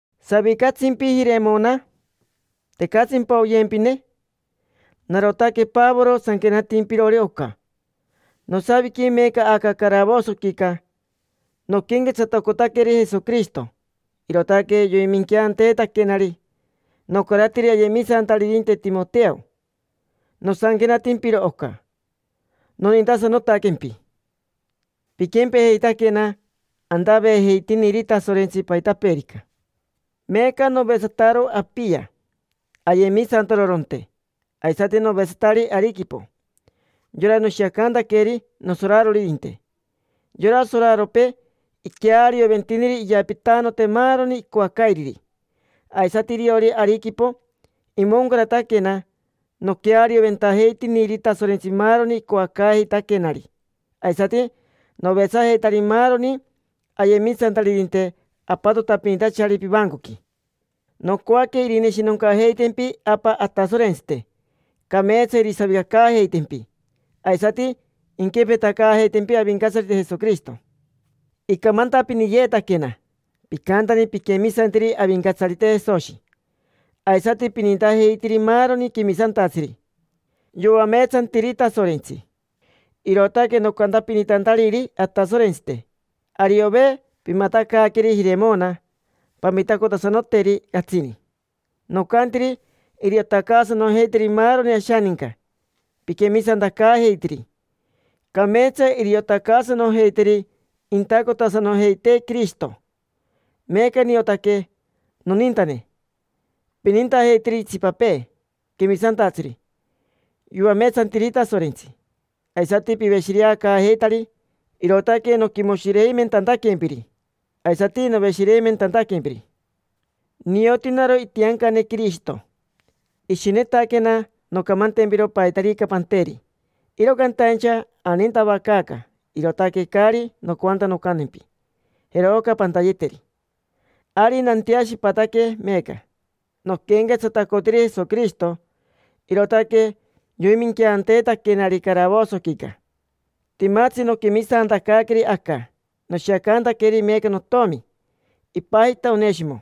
¿Savicatsimpi, Jiremona? ¿Tecatsimpa oyempine? Narotaque Pavoro sanquenatimpirori oca. Nosaviqui meeca aca caravosoquica. Noquenquetsatacotaqueri Jesoquirishito, irootaque yoiminqueanteetaquenari. Nocaratiri ayemisantaririnte Timoteo nosanquenatimpiro oca. Nonintasanotaquempi. Piquempejeitaquena, antaveejeitiniri Tasorentsi paitapeerica. Meeca novetsataro Apia, ayemisantaroronte. Aisati novetsatari Ariquipo, yora noshiacantaqueri nosoraroririnte. Yora soraropee iquearioventiniri iyapitanote maaroni icoacairiri. Aisati iriori Ariquipo, imoncarataquena, noquearioventajeitiniri Tasorentsi maaroni icoacaajeitaquenari. Aisati novetsajeitari maaroni ayemisantaririnte apatotapinitachari pivancoqui. Nocoaque irineshinoncajeitempi Apa Atasorentsite, cameetsa irisavicacaajeitempi. Aisati inquempetacaajeitempi Avincatsarite Jesoquirishito. Icamantapiniyeetaquena picantani piquemisantiri Avincatsarite Jesoshi, aisati pinintajeitiri maaroni quemisantatsiri yoameetsantiri Tasorentsi. Irootaque nocantapinitantariri Atasorentsite: “Ariove pimatacaaqueri Jiremona pamitacotasanoteri catsini”. Nocantiri iriotacaasanojeiteri maaroni ashaninca piquemisantacaajeitiri. Cameetsa iriotacaasanojeiteri intacotasanojeitee Quirishito. Meeca niotaque, nonintane, pinintajeitiri itsipapee quemisantatsiri yoameetsantiri Tasorentsi, aisati piveshireacaajeitari, irootaque noquimoshireimentantaquempiri, aisati noveshireimentantaquempiri. Nioti naro itiancane Quirishito: ishinetaquena noncamantempiro paitarica panteri, iro cantaincha anintavacaaca, irootaque caari nocoanta noncantempi: “Jero oca pantayeteri”. Ari nanteashipataque meeca. Noquenquetsatacotiri Jesoquirishito, irootaque yoiminqueanteetaquenari caravosoquica. Timatsi noquemisantacaaqueri aca, noshiacantaqueri meeca notomi. Ipajita Oneshimo: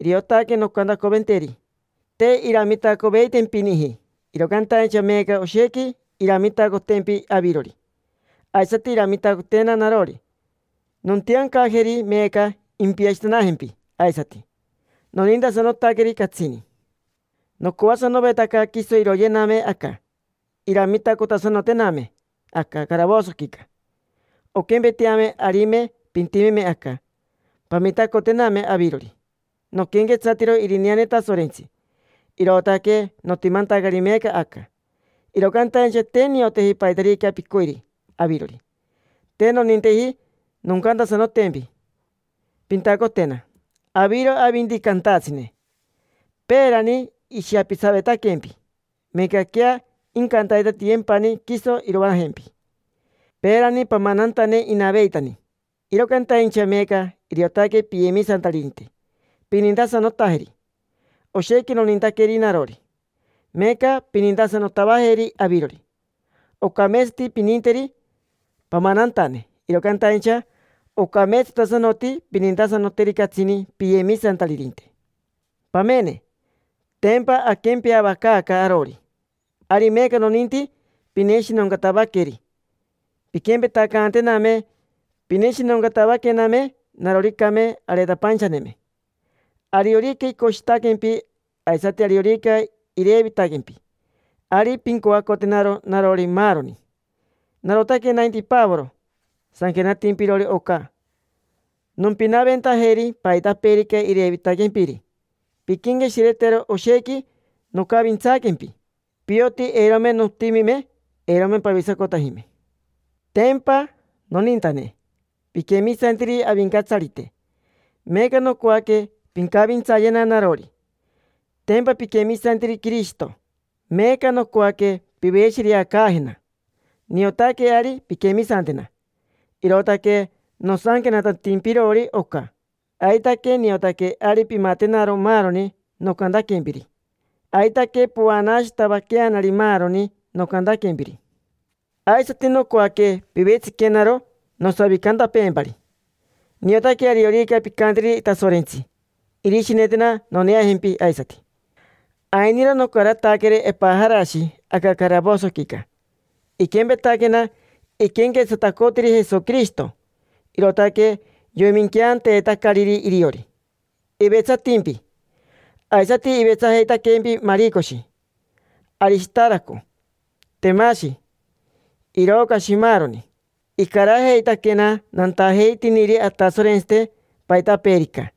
iriotaque noncantacoventeri. Te iramitacoveitempiniji, iro cantaincha meeca oshequi iramitacotempi avirori, aisati iramitacotena narori. Nontiancajeri meeca impiashitanajempi aisati. Nonintasanotaqueri catsini. Nocoasanovetaca quiso iroyename aca, iramitacotasanotename aca caravosoquica: onquempeteame arime pintimeme aca, pamitacotename avirori. Noquenquetsatiro irineane Tasorentsi, irootaque notimantacari meeca aca. Iro cantaincha te nioteji paitarica picoiri avirori. Te noninteji noncantasanotempi pintacotena: aviro avinti cantatsine. Peerani ishiapitsavetaquempi, meecaquea incantaitatiyempani quiso iroajempi. Peerani pamanantane inaveitani. Iro cantaincha meeca iriotaque piyemisantaririnte pinintasanotajeri. Oshequi nonintaqueri narori, meeca pinintasanotavajeri avirori. Ocameetsati pininteri pamanantane, iro cantaincha ocameetsatasanoti pinintasanoteri catsini piyemisantaririnte. Pamene, tempa aquempeavacaaca arori. Ari meeca noninti pineshinoncatavaqueri, pinquempetacantename pineshinoncatavaquename naroricame areetapainchaneme. Ariorica icoshitaquempi, aisati ariorica irevitaquempi, ari pincoacotenaro narori maaroni. Narotaque nainti Pavoro sanquenatimpirori oca. Nompinaventajeri paitapeerica irevitaquempiri. Pinquenqueshiretero oshequi nocavintsaaquempi: pioti eirome notimime, eirome pavisacotajime. Tempa, nonintane, piquemisantiri Avincatsarite, meeca nocoaque pincavintsayena narori. Tempa piquemisantiri Quirishito, meeca nocoaque piveshireacaajena. Niotaque ari pinquemisantena, irootaque nosanquenatantimpirori oca. Aitaque niotaque ari pimatenaro maaroni nocantaquempiri, aitaque povanaashitavaqueanari maaroni nocantaquempiri. Aisati nocoaque pivetsiquenaro nosavicantapeempari. Niotaque ariorica pincanteri Tasorentsi, irishinetena noneajempi aisati. Ainiro nocarataqueri Epajarashi aca caravosoquica. Iquempetaquena iquenquetsatacotiri Jesoquirishito, irootaque yoiminqueanteetacariri iriori. Ivetsatimpi. Aisati ivetsajeitaquempi Maricoshi, Arishitaraco, Temashi, Irocashi, maaroni. Icarajeitaquena nantajeitiniri Atasorentsite paitapeerica.